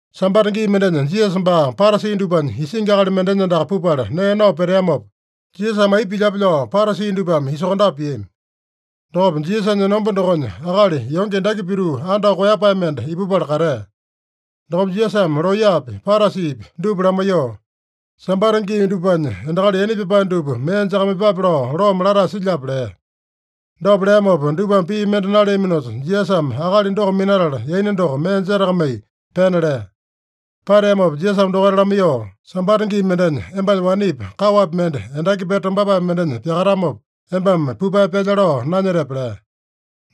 Sambata gii mendenya Jisasa baa Parasi dupanya isingi akali mendenya andaka pupala nee nao peteamopa, Jisasame aipa pilyape lao Parasi dupame isokondape piami. Dokopa Jisasanya enomba dokonya, akali yonge endaki pituu andao koeyapae mende ipupala katea. Dokopa Jisasame looyapi, Parasipi dupa lamaiyoo, “Sambata gii dupanya endakali yaina pyapae dupa mee jakamaiyepape lao loome latae silyape?” lea. Dopa leamopa dupame pii mende naleaminosa, Jisasame akali doko minatala, yaina doko mee jetakamai pena lea. Pateamopa Jisasame dokaita lamaiyoo, “Sambata gii mendenya, embanya wanepi, kaowapi mende endaki pete tombapae mendenya pyakatamopa, embame pupae pyalya lao nanyetepe?” lea.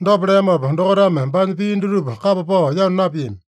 Dopa leamopa dokaitame baanya pii dutupa kapa pao yanu napiami.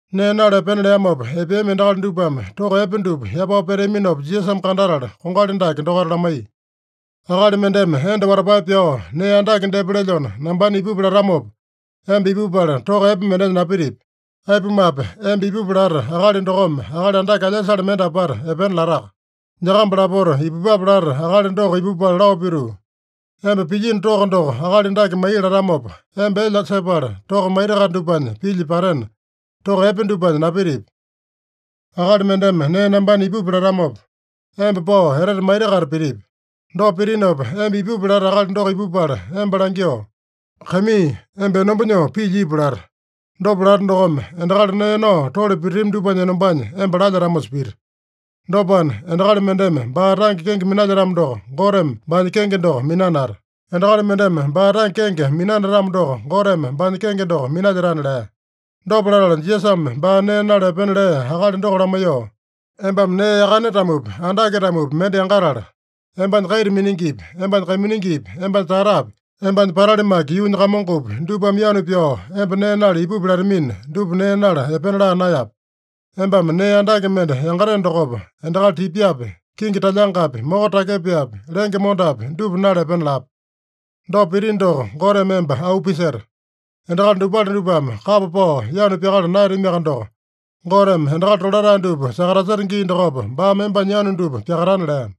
Nee nala epena leamopa epeami endakali dupame toko epe dupa yapao peteaminopa Jisasame kandatala, kongali dake dokaita lamaiya: “Akali mendeme enda watapae pyao nee andake depa lelyona nambana ipupi latamopa, emba ipupala toko epe mendenya napitipi. Aipumape, emba ipupi lata akali dokome akali andake alyasale mende apata epena lataka. Nyakamba lapota ipupape lata akali doko ipupala lao pituu, ‘Emba pilyino toko doko akali dake mai’ latamopa, emba elya sepala toko maita-kaita dupanya pilya patena, toko epe dupanya napitipi. Akali mendeme nee nambana ipupi latamopa, emba pao etete maita-kaita pitipi. Dopa pitinopa, emba ipupi lata akali doko ipupala emba langyoo, ‘Kaimii, emba enomba nyoo pilya ipu’ lata. Dopa lata dokome, endakali nee nao tole pititami dupanya enombanya emba lalyetamosa pita. Dopana, endakali mendeme baa tange kenge minalyetamo doko, Goteme baanya kenge doko minanata. Endakali mendeme baa tange kenge minanatamo doko, Goteme baanya kenge doko minalyetana” lea. Dopa latala Jisasame baa nee nala epena lea akali doko lamaiyoo, “Embame nee yakane-tamopi, andake-tamopi mende yangatala, embanya kaita miningipi, embanya kaiminingipi, embanya tatapi, embanya patali maki yuunya kamongopi, dupame yanu pyao emba nee nala ipupi latamina, dupa nee nala epena laa naeyape. Embame nee andake mende yangateno dokopa, endakali tipyapi, kingi talyangapi, moko takyepaepi, lenge mondapi dupa nala epena lape. Dopa pitino doko, Goteme emba auu piseta. Endakali dopale dupame kapa pao yanu pyakala naeyatamiaka doko, Goteme endakali tolatae dupa sakataseta gii dokopa, baame embanya yanu dupa pyakatana” lea.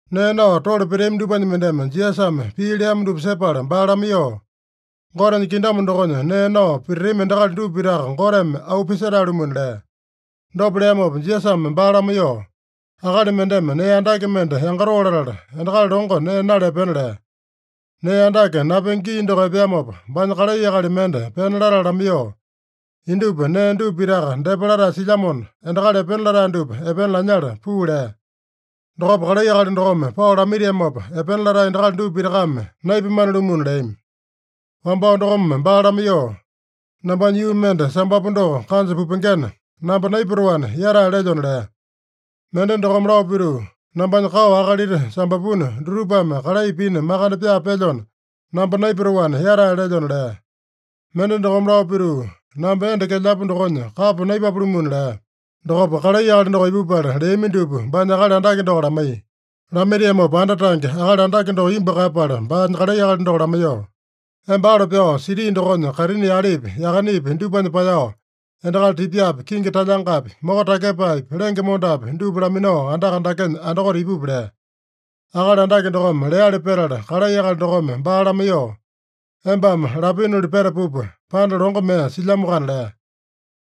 Nee nao tole peteami dupanya mendeme Jisasame pii leamo dupa sepala baa lamaiyoo, “Gotenya kingdom dokonya nee nao pititami endakali dupa pitaka Goteme auu pisetae-lumuna” lea. Dopa leamopa Jisasame baa lamaiyoo, “Akali mendeme nee andake mende yangatoo latala, endakali longo nee nala epena lea. Nee andake napenge gii doko epeamopa, baanya kalai akali mende pena latala lamaiyoo, ‘Indupa nee dupa pitaka depa latae silyamona, endakali epena latae dupa epena lanyala puu’ lea. Dokopa kalai akali dokome pao lamaitiamopa, epena latae endakali dupa pitakame naipamane-lumuna leami. Wambao dokome baa lamaiyoo, ‘Nambanya yuu mende sambapu doko kanja pupengena, namba naipatoana, yatae lelyona’ lea. Mende dokome lao pituu, ‘Nambanya kao akalita sambapuna, dutupame kalai pina makande pyaa pelyona, namba naipatoana, yatae lelyona’ lea. Mende dokome lao pituu, ‘Namba enda kelyapu dokonya kapa naipapo-lumuna’ lea. Dokopa kalai akali doko ipupala, leami dupa baanya akali andake doko lamaiya. Lamaitiamopa anda tange, akali andake doko imbu kaeyapala, baanya kalai akali doko lamaiyoo, ‘Emba alo pyao siti dokonya kaitini yalepi, yakanepi dupanya paeyao, endakali tipyapi, kingi talyangapi, moko takyepaepi, lenge mondapi dupa laminao andaka dakenya andakote ipupi’ lea. Akali andake dokome leali petala, kalai akali dokome baa lamaiyoo, ‘Embame lapinoli petapupa, panda longo mee silyamoakana’ lea.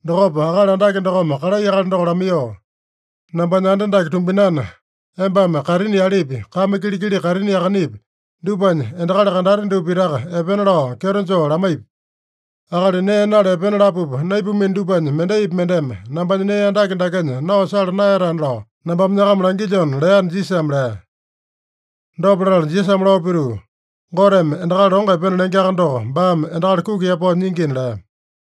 Dokopa akali andake dokome kalai akali doko lamaiyoo, ‘Nambanya anda dake tumbinana, embame kaitini yalepi, kame kilikili kaitini yakanepi, dupanya endakali kandate dupa pitaka epena lao kyeto joo lamaipi. Akali nee nala epena lapupa naipamino dupanya mendaipi mendeme nambanya nee andake dakenya nao sala naeyatana lao nambame nyakama langilyona’ leana” Jisasame lea. Dopa latala Jisasame lao pituu, “Goteme endakali longo epena lengeaka doko, baame endakali kuki yapao nyingina” lea.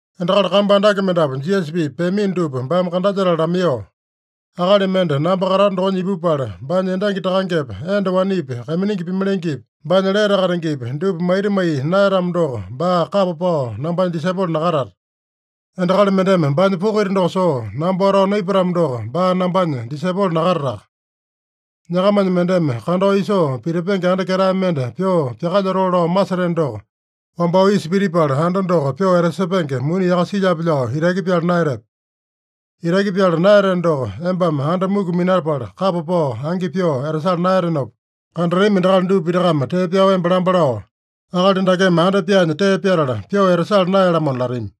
Endakali kambu andake mendapu Jisasa-pipa peamino dupa baame kandalyetala lamaiyoo, “Akali mende namba katato dokonya ipupala, baanya endangi takangepa, enda wanepi, kaiminingi pimalengepi, baanya lete katengepi, dupa maita maiya naeyatamo doko, baa kapa pao nambanya disaipolo nakatata. Endakali mendeme baanya poko ita doko soo, namba watao naipatamo doko, baa nambanya disaipolo nakatataka. Nyakamanya mendeme kandao isoo pitipenge anda ketae mende pyoo pyakalyotoo lao maseteno doko, wambao isa pitipala, anda doko pyoo etasepenge muni yaka silyape lao itaki pyala naeyatepe? Itaki pyala naeyateno doko, embame anda muku minapala kapa pao angi pyoo etasala naeyatenopa, kandatami endakali dupa pitakame tee pyao emba lamba lao, ‘Akali dakeme anda pyaanya tee pyatala, pyoo etasala naeya-lamona’ latami.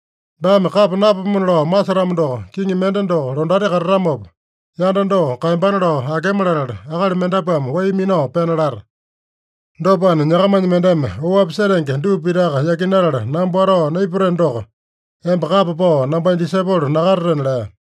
Baame kapa napapomona lao masetamo doko, kiŋi mende doko londati katatamopa, yanda doko kaeyambana lao akema latala, akali mendapuame wai minao pena lata. Dopana, nyakamanya mendeme oapi setenge dupa pitaka yakinatala namba watao naipateno doko, emba kapa pao nambanya disaipolo nakatatena” lea.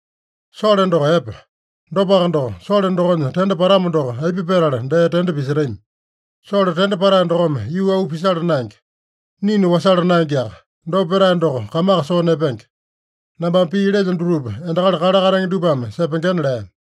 “Sole doko epe. Dopaka doko, sole dokonya tende patamo doko, aipa petala dee tende pisetami? Sole tende patae dokome yuu auu pisala naenge. Ninu wasala naengeaka. Dopa petae doko kamaka soo nepenge. Nambame pii lelyo dutupa endakali kale katenge dupame sepengena” lea.